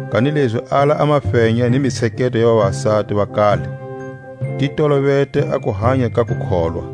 Kanilezi ala a mafenya ni mitsheketo ya vavasati va kale. Ti tolovete a kuhanya ka kukholwa.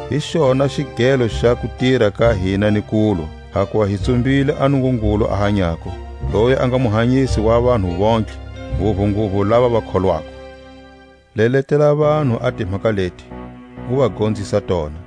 Hi xona xigelo xa kutira ka hina ni kulwa, hakuva hi tsumbile a Nungungulu a hanyako, loyi a nga Muhanyisi wa vanhu vontlhe, nguvunguvu lava va kholwako. Leletela vanhu a timhaka leti, u va gonzisa tona.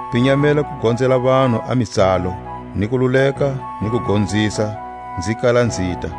Pinyamela ku gonzela vanhu a mitsalo, ni ku luleka ni ku gonzisa, nzi kala nzita.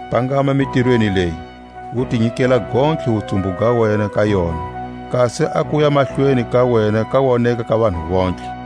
Pangama mitirweni leyi, u ti nyikela gontlhe wutsumbu ga wena ka yona; kasi a kuya mahlweni ka wena ka woneka ka vanhu vontlhe.